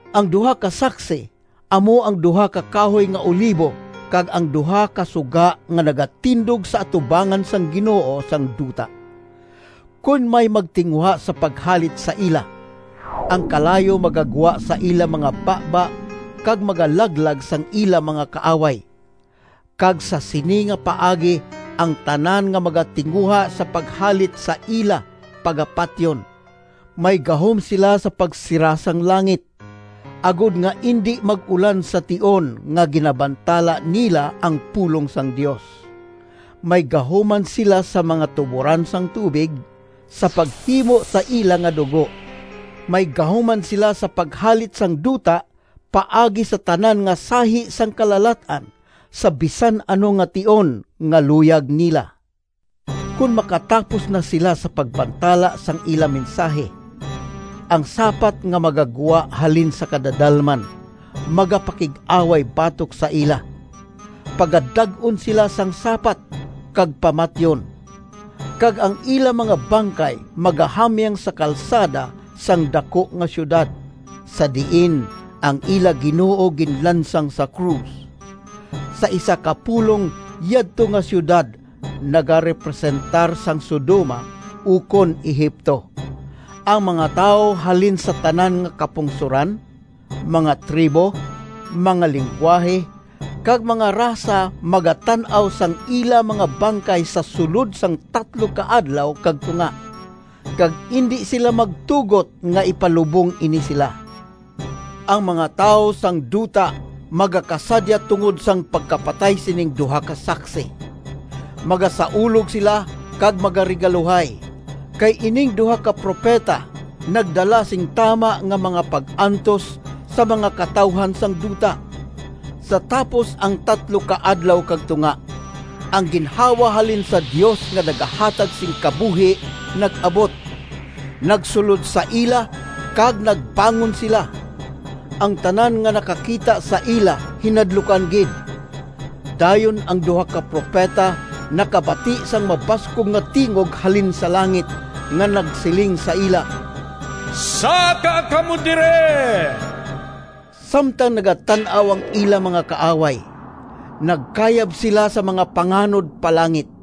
Ang duha ka saksi amo ang duha ka kahoy nga olivo kag ang duha ka suga nga nagatindog sa atubangan sang Ginoo sang duta. Kon may magtinguha sa paghalit sa ila, ang kalayo magagwa sa ila mga baba kag magalaglag sang ila mga kaaway. Kag sa sini nga paagi ang tanan nga magatinguha sa paghalit sa ila pagapatyon. May gahom sila sa pagsira sang langit, agod nga indi mag-ulan sa tion nga ginabantala nila ang pulong sang Dios. May gahom man sila sa mga tuboran sang tubig sa paghimo sa ila nga dugo. May gahom man sila sa paghalit sang duta paagi sa tanan nga sahi sang kalalat-an, sa bisan ano nga tion nga luyag nila. Kon makatapos na sila sa pagbantala sang ila mensahi, ang sapat nga magagwa halin sa kadadalman magapakig-away batok sa ila. Pagadag-on sila sang sapat kag pamatyon, kag ang ila mga bangkay magahamyang sa kalsada sang daku nga siyudad, sa diin ang ila Ginoo ginlansang sa krus. Sa isa ka pulong yadto nga siyudad nagarepresentar sang Sodoma, ukon Egipto. Ang mga tawo halin sa tanan nga kapungsoran, mga tribo, mga linggwahe kag mga rasa magatan-aw sang ila mga bangkay sa sulod sang tatlo ka adlaw kag tunga, kag indi sila magtugot nga ipalubong ini sila. Ang mga tawo sang duta magakasadya tungod sang pagkapatay sining duha ka saksi. Magasaulog sila kag magaregaluhay, kay ining duha ka propeta nagdala sing tama nga mga pag-antos sa mga katawuhan sang duta. Sa tapos ang tatlo ka adlaw kag tunga, ang ginhawa halin sa Dios nga nagahatag sing kabuhi nag-abot, nagsulod sa ila, kag nagbangon sila. Ang tanan nga nakakita sa ila hinadlukan gid. Dayon ang duha ka propeta nakabati sang mabaskog nga tingog halin sa langit nga nagsiling sa ila, “Saka kamo diri!” Samtang nagatan-aw ang ila mga kaaway, nagkayab sila sa mga panganod pa langit.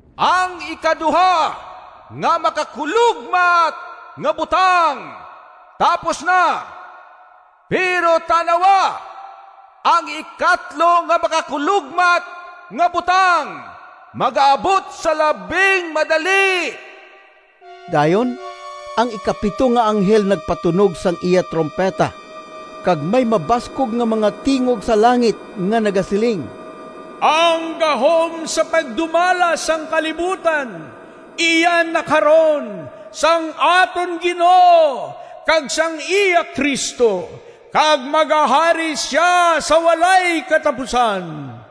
Ang ikaduha nga makakulogmat nga butang tapos na. Pero tan-awa! Ang ikatlo nga makakulogmat nga butang magaabot sa labing madali. Dayon ang ikapito nga anghel nagpatunog sang iya trumpeta, kag may mabaskog nga mga tingog sa langit nga nagasiling, “Ang gahom sa pagdumala sang kalibutan iya na karon sang aton Ginoo kag sang iya Cristo, kag magahari sia sa walay katapusan!”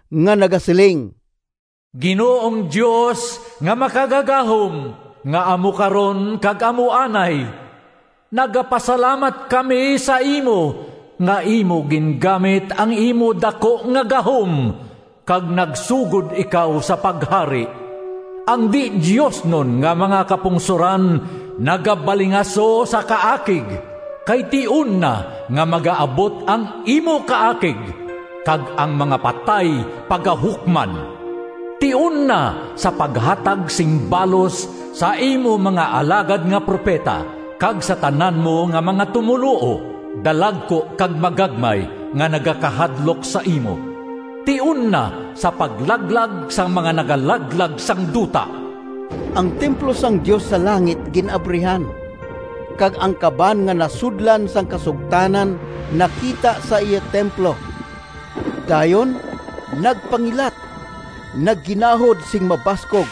nga nagasiling: “Ginoong Dios nga Makagagahom, Nga amo karon kag amo anay! Nagapasalamat kami sa imo Nga imo gingamit Ang imo daku nga gahom Kag nagsugod ikaw sa paghari! Ang di-diosnon nga mga kapungsoran Nagabalingaso sa kaakig, Kay tion na nga magaabot Ang imo kaakig, Kag ang mga patay pagahukman. Tion na sa paghatag sing balos Sa imo mga alagad nga propeta, Kag sa tanan mo nga mga tumoluo, Dalagku kag magagmay, Nga nagakahadlok sa imo. Tion na sa paglaglag Sang mga nagalaglag sang duta!” Ang templo sang Dios sa langit gin-abrihan, kag ang kaban nga nasudlan sang kasugtanan nakita sa iya templo. Dayon nagpangilat, nagginahod sing mabaskog,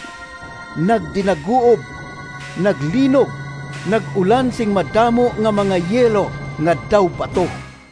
nagdinaguob, naglinog, nag-ulan sing madamo nga mga yelo nga daw bato.